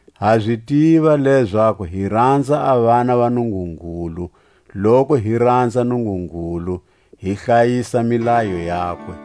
Ha zi tiva lezaku hi ranza a vana va Nungungulu, loku hi ranza Nungungulu, hi hlayisa milayo yakwe.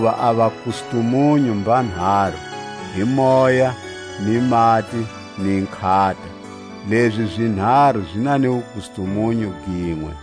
Hakuva a vakustumunyu mbanharu, hi Moya, ni mati, ni nkhata; lezi zinharu zi na ni wukustumunyu ginwe.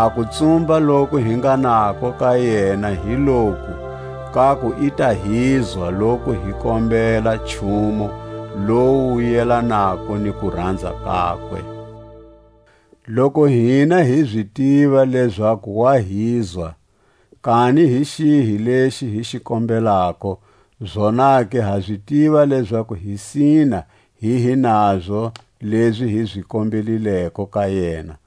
A kutsumba loku hi nga nako ka yena hi loku, kaku i ta hizwa loku hi kombela nchumu lowu wu yelanako ni kuranza kakwe. Loku hina hi zi tiva lezaku wa hizwa, kani hi xihi lexi hi xi kombelako, zonake ha zi tiva lezaku hi sina hi hi nazo lezi hi zi kombelileko ka yena.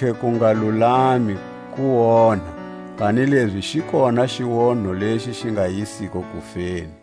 Kontlhe kungalulami kuonha; kanilezi xi kona xionho lexi xi nga yisiko kufeni.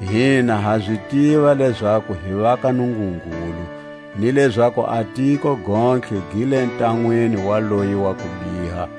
Hina ha zi tiva lezaku hi va ka Nungungulu, ni lezaku a tiko gontlhe gi le ntanwini wa loyi wa kubiha.